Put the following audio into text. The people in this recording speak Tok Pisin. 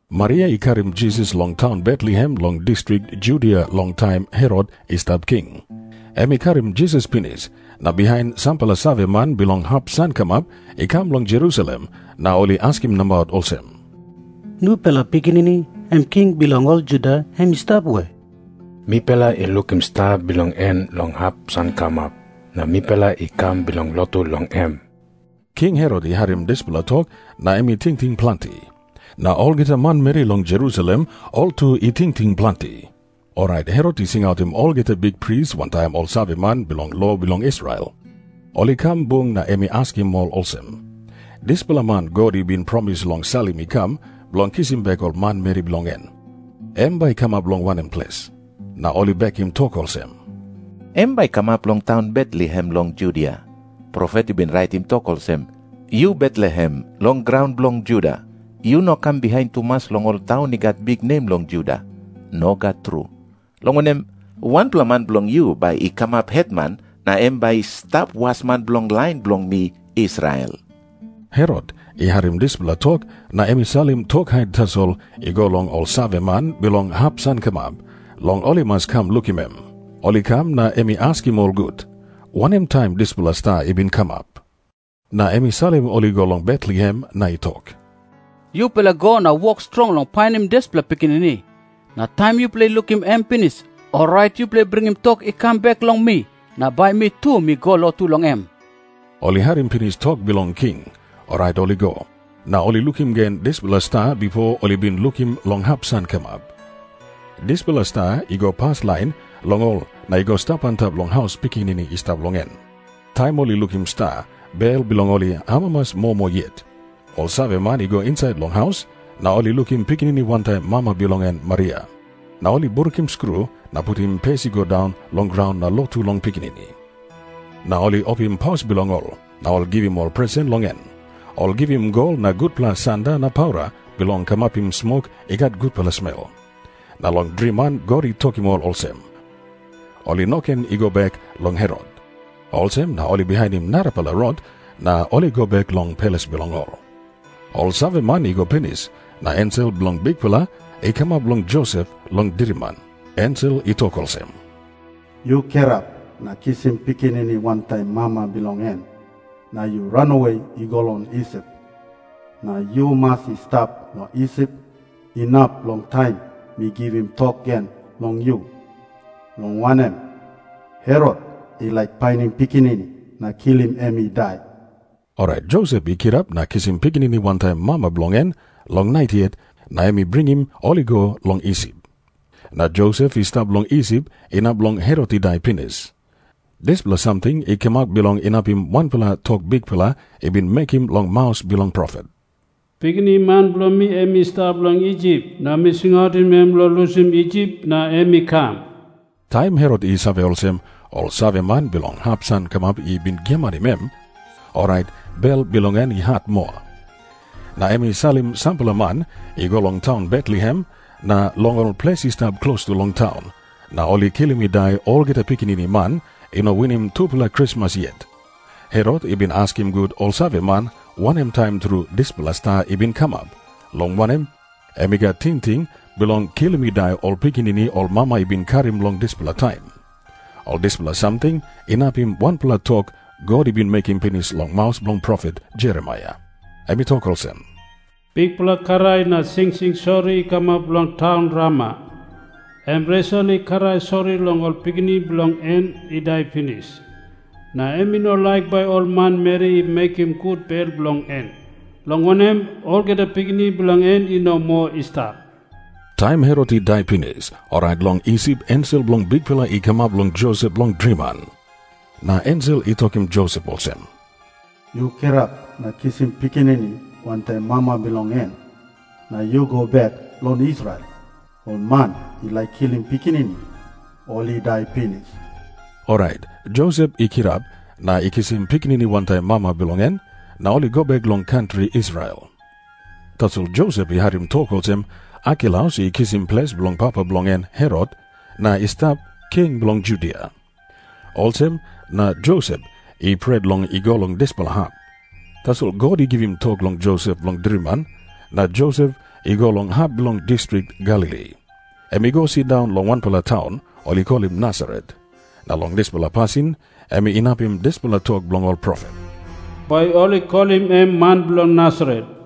Maria i karim Jisas long taun Betlehem long distrik Judia long taim Herot i stap king. Em i karim Jisas pinis, na bihain sampela saveman bilong hap sankamap i kam long Jerusalem na ol i askim nabaut olsem, “Nupela pikinini em king bilong ol Juda, em i stap we? Mipela i lukim sta bilong en long hap sankamap, na mipela i kam bilong lotu long em.” King Herot i harim dispela tok, na em i tingting planti. Na olgeta manmeri long Jerusalem ol tu i tingting planti. Orait Herot i singautim olgeta bikpris wantaim ol saveman bilong lo bilong Israel. Ol i kam bung na em i askim ol olsem, “Dispela man God i bin promis long salim i kam bilong kisim bek ol manmeri bilong en, em bai i kamap long wanem ples?” Na ol i bekim tok olsem, “Em bai i kamap long taun Betlehem long Judia. Profet i bin raitim tok olsem, ‘Yu Betlehem, long graun bilong Juda, yu no kam bihain tumas long ol taun i gat biknem long Juda. Nogat tru. Long wanem, wanpela man bilong yu bai i kamap hetman na em bai i stap wasman bilong lain bilong mi, Israel.’” Herot i harim dispela tok na em i salim tok hait tasol i go long ol saveman bilong hap sankamap, long ol i mas kam lukim em. Ol i kam na em i askim ol gut, wanem taim dispela sta i bin kamap. Na em i salim ol i go long Betlehem, na i tok, “Yupela go na wok strong long painim dispela pikinini. Na taim yupela i lukim em pinis, orait yupela bringim tok i kam bek long mi, na bai mi tu mi go lotu long em.” Ol i harim pinis tok bilong king, orait ol i go. Na ol i lukim gen dispela sta bipo ol i bin lukim long hap sankamap. Dispela sta i go paslain long ol na i go stap antap long haus pikinini i stap long en. Taim ol i lukim sta, bel bilong ol i amamas moa moa yet. Ol saveman i go insait long haus, na ol i lukim pikinini wantaim mama bilong en Maria. Na ol i brukim skru na putim pes i go daun long graun na lotu long pikinini. Na ol i opim paus bilong ol, na ol i givim ol presen long em. Ol i givim gol na gutpela sanda na paura bilong kamapim smok i gat gutpela smel. Na long driman God i tokim ol olsem, ol i no ken i go bek long Herot. Olsem na ol i bihainim narapela rot na ol i go bek long ples bilong ol. Ol saveman i go pinis, na ensel bilong Bikpela i kamap long Josep long driman. Ensel i tok olsem, “Yu kirap na kisim pikinini wantaim mama bilong en, na yu ranawe i go long Isip. Na yu mas i stap long Isip inap long taim mi givim tok gen long yu, long wanem, Herot i laik painim pikinini na kilim em i dai.” Orait Josep i kirap na i kisim pikinini wantaim mama bilong en long nait yet, na em i bringim ol i go long Isip. Na Josep i stap long Isip inap long Herot i dai pinis. Dispela samting i kamap bilong inapim wanpela tok Bikpela i bin mekim long maus bilong profet. Em i bin tok olsem, “Pikinini man bilong mi em i stap long Isip, na mi singautim em long lusim Isip na em i kam.” Taim Herot i save olsem, ol saveman bilong hap sankamap i bin giamanim em, orait bel bilong en i hat moa. Na em i salim sampela man i go long taun Betlehem na long ol ples i stap klostu long taun, na ol i kilim i dai olgeta pikinini man i no winim tupela krismas yet. Herot i bin askim gut ol saveman wanem taim tru dispela sta i bin kamap, long wanem, em i gat tingting bilong kilim i dai ol pikinini ol mama i bin karim long dispela taim. Ol dispela samting inapim wanpela tok God i bin mekim pinis long maus bilong profet Jeremaia. Em i tok olsem, “Bikpela krai na singsing sori i kamap long taun Rama. Em Resel i krai sori long ol pikinini bilong en i dai pinis. Na em i no laik bai ol manmeri i mekim gut bel bilong en, long wanem, olgeta pikinini bilong en i no moa i stap.” Taim Herot i dai pinis, orait long Isip ensel bilong Bikpela i kamap long Josep long driman. Na ensel i tokim Josep olsem, “Yu kirap na kisim pikinini wantaim mama bilong en, na yu go bek long Israel. Ol man i laik kilim pikinini, ol i dai pinis.” Orait Josep i kirap, na i kisim pikinini wantaim mama bilong en, na ol i go bek long kantri Israel. Tasol Josep i harim tok olsem Arkelaus i kisim ples bilong papa bilong en Herot, na i stap king bilong Judia. Olsem na Josep i pret long i go long dispela hap. Tasol God i givim tok long Josep long driman, na Josep i go long hap bilong distrik Galili. Em i go sindaun long wanpela taun ol i kolim Nasaret, na long dispela pasin em inapim dispela tok bilong ol profet, “Bai ol i kolim em man bilong Nasaret.”